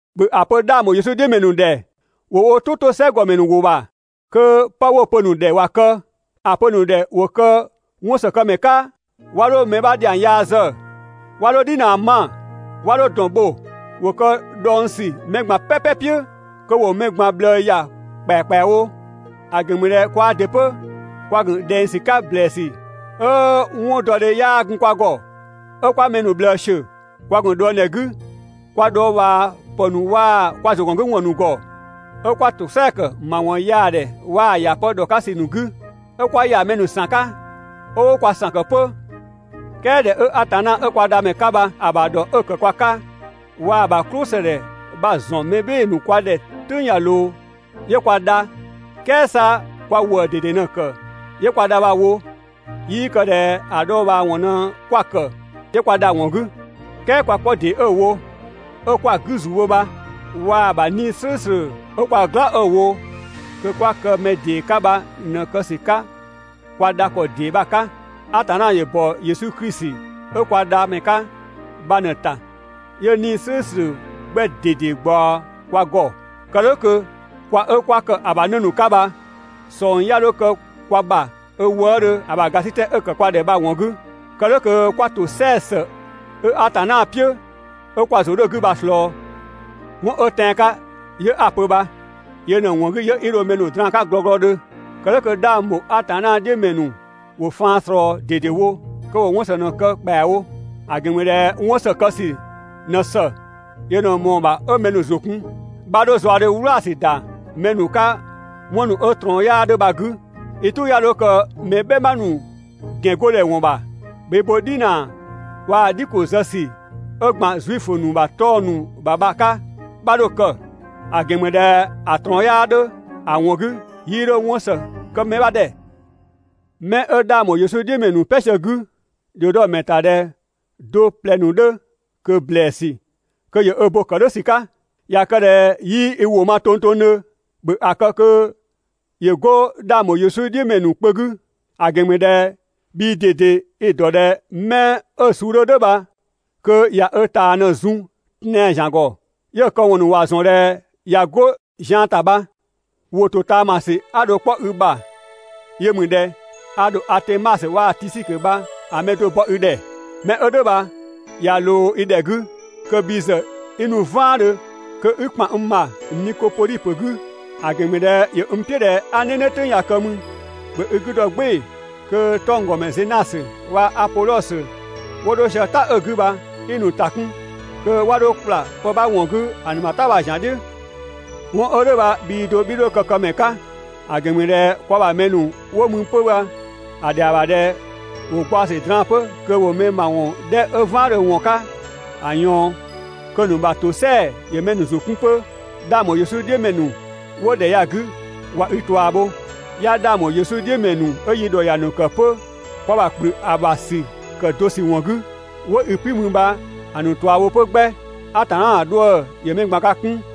‑Bhö ‑a pö 'dhang ‑bho Yesu "dhiʋ̈ ‑mɛ ‑nu ‑dhɛ ‑wo wo "tʋ 'to "sɛ ‑gɔmɛ ‑nu ‑wʋ ‑bha, kö 'pë 'wo‑ pö‑ ‑nu ‑dhɛ ‑wa kë. ‑A pö‑ ‑nu ‑dhɛ ‑wo kë 'wɔnsëkëmɛ 'ka, 'wa 'dho mɛ 'bha ‑dhiang yaa zë, 'wa 'dho "dhinaa 'ma, 'wa 'dho ‑dɔn bho. ‑Wo kë dhɔngsü mɛ ꞊gban "pɛpɛ "piʋ̈, kö ‑wo mɛ ꞊gban ꞊bhlëë ‑ya ‑kpɛakpɛawo. ‑A ‑gɛn ‑mü ꞊dhɛ kwaa ‑dɩ 'pö kwa ‑gun ꞊dhɛng ‑sü 'ka ‑blɛɛsü 'ö 'wɔndɔdhe 'yaa gun kwa ‑gɔ, 'ö 'kwa mɛ ‑nu ꞊bhlëë ‑siö, kwa ‑gun ꞊dhuëngdhɛ 'gü kwa dhɔɔbhaa ‑pë ‑nu waa‑ kwa ‑zʋgɔngüwɔn ‑nu ‑gɔ, 'ö 'kwa ‑tosɛa ‑kë ‑mawɔn yaa ‑dhɛ waa‑ ‑ya pë ‑dhɔ 'ka ‑sü ‑nu 'gü, 'ö 'kwa ‑ya mɛ ‑nu ‑san 'ka, 'ö 'wo kwa ‑san ‑kë 'pö. "Kɛɛ ꞊dhɛ 'ö Atanna 'ö kwa Dhamɛ 'ka bha‑ ‑bha ‑dhɔ 'ö‑ ‑kë kwa 'ka, waa‑ ‑bha "klʋsëdhɛ bha‑ ‑zɔn mɛ "bhɩɩ‑ ‑nu kwa ‑dhɛ "tʋ̈ng ꞊ya ꞊loo, 'yö kwa dha, "kɛɛ 'sa kwa ‑wëë ꞊dede ꞊në‑ ‑kë 'yö kwa dha bha‑ wo, 'yii kë ꞊dhɛ ‑a dhɔɔbhaawɔn ꞊në 'kwa‑ ‑kë 'yö 'kwa dha‑ ‑wɔn 'gü; "kɛɛ kwa 'kpɔ ‑dee 'ö‑ wo, 'ö 'kwa‑ 'gü ‑zu bho bha, waa‑ ‑bha 'Nii‑ "slʋ̈ʋ̈slʋ̈ 'ö kwa "gla 'ö‑ wo kö 'kwa kë mɛ ‑dee 'ka bha ꞊në kë ‑sü 'ka kwa dha ‑kɔ ‑dee bha‑ 'ka. Atanna ‑yö ‑bɔ Yesu Klisi 'ö kwa Dhamɛ 'ka bha ꞊në‑ ‑ta 'yö 'Nii‑ "slʋ̈ʋ̈slʋ̈ 'gbɛ ꞊dede ꞊gbaɔ kwa ‑gɔ. Kë "dhʋ̈ kö (kwa 'ö 'kwa ‑kë ‑a ‑bha 'në ‑nu 'ka bha) ꞊sɔng 'ya 'dho kë kwa ‑bha 'ö wëëdhö ‑a ‑bha ‑gasitɛ 'ö‑ ‑kë kwa ‑dhɛ bha‑ ‑wɔn 'gü, kë "dhʋ̈ kö 'kwa ‑tosɛa ‑së 'ö Atanna "piʋ̈ 'ö kwa ‑zʋ 'dhö‑ 'gü bha‑ ‑slɔɔ. 'Wɔn 'ö tɛan‑ 'ka 'yö 'a‑ pö bha. Yö ꞊në‑ ‑wɔn 'gü 'yö 'i dho mɛ ‑nu draan‑ 'ka glɔglɔdhö. Kë "dhʋ̈ kö 'dhang ‑bho Atanna "dhiʋ̈ ‑mɛ ‑nu ‑wo faan ꞊slɔɔ ꞊dedewo kö ‑wo 'wɔn ‑së ꞊në‑ kë ‑kpɛawo. ‑A ‑gɛn ‑mü ꞊dhɛ 'wɔn ‑së kë ‑sü ꞊në ‑së, yö ꞊në ꞊mɔɔ‑ ‑bha 'ö mɛ ‑nu ‑zʋ kun. 'Bha 'dho zaɔdhe "wlaasü ‑da mɛ ‑nu 'ka 'wɔn ‑nu 'ö‑ ꞊trɔɔn 'yaa 'dhö bha‑ 'gü. I "tʋ 'ya 'dho kë mɛ "bhɛma ‑nu ‑gɛngodhɛ ‑wɔn ‑bha. ‑Bhö i bo "dhinaa waa‑ "dhi ‑ko zë ‑sü 'ö ‑gban Zuifö ‑nu ‑bha 'tɔng‑ ‑nu ‑bha bha‑ 'ka. 'Bha 'dho‑ kë, ‑a ‑gɛn ‑mü ꞊dhɛ ‑a ꞊trɔɔn 'yaa 'dhö, ‑a ‑wɔn 'gü 'yii 'dho 'wɔn ‑së kë mɛ 'bha ‑dhɛ. 'Mɛ 'ö 'dhang ‑bho Yesu "dhiʋ̈ ‑mɛ ‑nu "pɛ sië‑ 'gü, ‑dhio dɔ‑ ‑mɛ ‑ta ꞊dhɛ do ꞊plɛ ‑nu 'dhö ꞊kö ‑blɛɛsü kö ‑yö ö bo‑ ‑kë "dhʋ̈ ‑sü 'ka. ꞊Ya kë ꞊dhɛ 'yii i ‑wʋ ma tongtongdhö, ‑bhö ‑a kë kö ‑yö 'go 'dhang ‑bho Yesu "dhiʋ̈ ‑mɛ ‑nu kpö 'gü. ‑A ‑gɛn ‑mü ꞊dhɛ bhii ꞊dede i‑ ‑dɔ ꞊dhɛ 'mɛ 'ö suu 'dhö "dhʋ̈ bha kö ꞊ya ö ꞊taa ꞊në‑ zun tɛan‑ ‑zian ‑gɔ, 'yö‑ këwɔn ‑nu ‑wa ‑zɔn ꞊dhɛ ꞊ya 'go zian ‑ta bha. ‑Wʋ ‑totaamasü 'a dho‑ 'kpɔ i ‑bha yö ‑mü ꞊dhɛ: a ‑dho Atemasö waa‑ Tisikö bha‑ mɛ do bɔ i ‑dhɛ. 'Mɛ 'ö "dhʋ̈ bha ꞊ya ꞊loo i ‑dhɛ 'gü kö bhi ‑zë 'i nu "vaandhö kö 'i ‑kpan n ‑bha Nikopodhi ‑pö 'gü, ‑a ‑gɛn ‑mü ꞊dhɛ ‑yö n "piʋ̈ ꞊dhɛ 'a "nɛnɛ "tʋ̈ng ya‑ kë mü. ‑Bhö i 'gü dɔ "gbɩɩ‑ kö 'tɔngdɔmɛ Zenasö waa‑ Apodhɔsö 'wo 'dho sië "ta 'ö‑ 'gü bha 'i‑ ‑nu ‑ta 'kun kö 'wa 'dho ‑kpla pë 'bha ‑wɔn 'gü ‑a ‑nu ‑bha "ta ‑zian bha‑ "dhiʋ̈. 'Wɔn 'ö "dhʋ̈ bha bhii do 'bhii 'dho kë‑ këmɛ 'ka. ‑A ‑gɛn ‑mü ꞊dhɛ kwa ‑bha mɛ ‑nu 'wo mü 'pö bha‑ ‑dhɛa ‑bha kö ‑wo gbaɔ‑ ‑sü draan‑ 'pö kö ‑wo mɛ ‑nu ‑mawɔn 'dhɛ 'ö "vaandhö ‑wɔn 'ka ‑a ꞊yaɔn, kö‑ ‑nu ‑bha ‑tosɛa ‑yö mɛ ‑nu ‑zʋ 'kun 'pö. 'Dhang ‑bho Yesu "dhiʋ̈ ‑mɛ ‑nu 'wo ‑dhɛ ya‑ 'gü ꞊wa i ꞊tua bho. 'Ya 'dhang ‑bho Yesu "dhiʋ̈ ‑mɛ ‑nu 'ö yi ‑dhɔ ‑ya ‑nu ‑kë 'pö kwa ‑bha ‑kplü ‑a ‑bha ‑sü ‑kë do ‑sü ‑wɔn 'gü, 'wo i "piʋ̈ mü bha‑ ‑nu ꞊tua bho 'pö 'gbɛ. Atanna ‑bha 'dhuë‑ ‑yö mɛ ꞊gban ka 'kun!